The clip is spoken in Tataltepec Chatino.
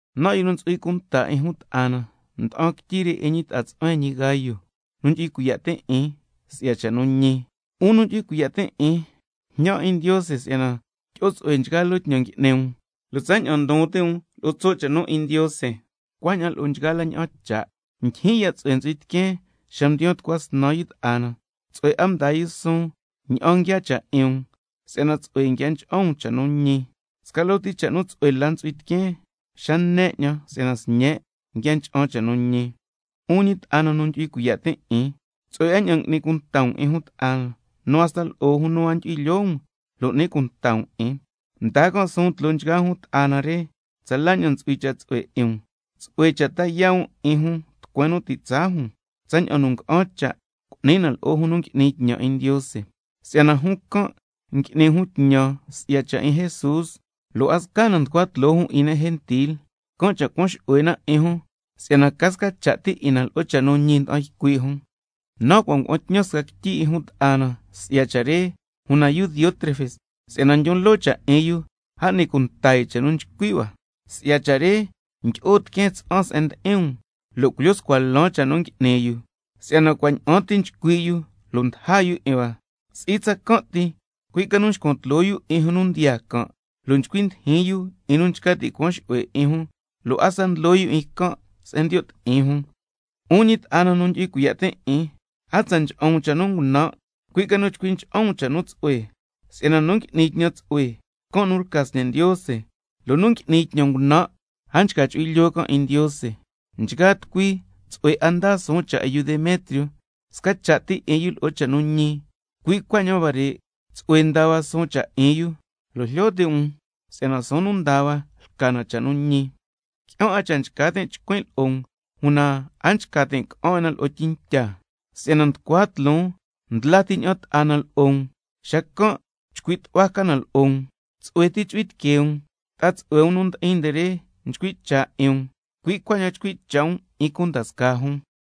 Nan', yu nu ntsu'hui cunta 'in jun ta'a na, nda'an quityi re 'in ñi ta'a tsu'huen ñi Gayo, nu ndyu'hui cuiya' tin' 'in si'ya cha' nu ñi. 'Un nu ndyu'hui cuiya' tin' 'in, njñan 'in Ndiose si'yana tyi'o tsu'hue nchgaa loo tñan ngui'ni um, lo' tsaña'an ndon ti' um lo'o tso' cha' nu 'in Ndiose, cuaña'an lo'o nchgaa la ña'an cha'. Ndyijyin ya' tsu'hue ntsu'hui tiqueen xa mdiyaan tucua snan yu ta'a na, tsu'hue 'a mdaa yu suun ña'an nguiaa cha' 'in um, si'yana tsu'hue nguia ncha'an um cha' nu ñi. Sca loo ti cha' nu tsu'hue la ntsu'hui tiqueen, xa ne 'ñan si'yana sñen' tsu'hue nguia ncha'an cha' nu ñi. 'Un ñi ta'a na nu ndyu'hui cuiya' tin' 'in, tsu'hue 'a ña'an n'ni cunta um 'in jun ta'a na, nu hasta lo'o jun nu a ndyu'hui lyoo um, lo' n'ni cunta um 'in. Mdaa can' suun tloo nchgaa jun ta'a na re tsa la ña'an ntsu'hui cha' tsu'hue 'in um. Tsu'hue cha' ta yaa' um 'in jun tucueen nu ti' tsaa jun, tsaña'an nu nga'an cha' cu'ni na lo'o jun nu ngui'ni tñan 'in Ndiose. Si'yana jun can' ngui'ni jun tñan si'ya cha' 'in Jesús, lo' a sca na nducua tloo jun 'in ne' gentil. Can' cha' cuan xu'hue na 'in jun, si'yana ca sca cha' ti 'in na lo'o cha' nu ñi nda'an ycui' jun. Nan' cua' ngua'an tñan sca quityi 'in jun ta'a na si'ya cha' re, una yu Diótrefes si'yana ndyon loo cha' nu 'in yu, a n'ni cunta yu cha' nu nchcui' hua. Si'ya cha' re ndyi'o tiqueen tsa'an se'en ndi'in um, lo' culyo scua lan cha' nu ngui'ni yu, si'yana cua' ña'an ti nchcui' yu lo' ndaja yu 'in hua. Si'i tsacan' ti, cui' ca nu nxcuan tloo yu 'in jun nu ndiyaa can', lo' nchcui ndijin yu 'in nu nchca ti' cuan xu'hue 'in jun, lo' hasta ndlo yu 'in can' se'en ndiyo' ti'in jun. 'Un ñi ta'a na nu ndyu'hui cuiya' tin' 'in, a tsa ncha'an um cha' ngunan', cui' ca nu chcui ncha'an um cha' nu tsu'hue. Si'yana nu ngui'ni tñan tsu'hue, can' nu lca sñe' Ndiose, lo' nu ngui'ni tñan ngunan', a nchca chu'hui lyoo can' 'in Ndiose. Nchgaa tucui tsu'hue 'a ndaa suun cha' 'in yu Demetrio, sca cha' ti 'in yu lo'o cha' nu ñi, cui' cuaña'an huare' tsu'hue ndaa hua suun cha' 'in yu, lo' jlyo ti' um si'yana suun nu ndaa hua lca na cha' nu ñi. Qui'an 'a cha' nchca tin' chcuin' lo'o um, una a nchca tin' ca'an 'in na lo'o tyintya, si'yana nducua tloon ndla ti ña'an ta'a na lo'o um, xacan' chcui' tu'hua ca na lo'o um. Tsu'hue ti chu'hui tiquee um. Ta'a tsu'hue um nu ndi'in nde re nchcui' cha' 'in um, cui' cuaña'an chcui' cha' um 'in cunda scaa jun nde cua.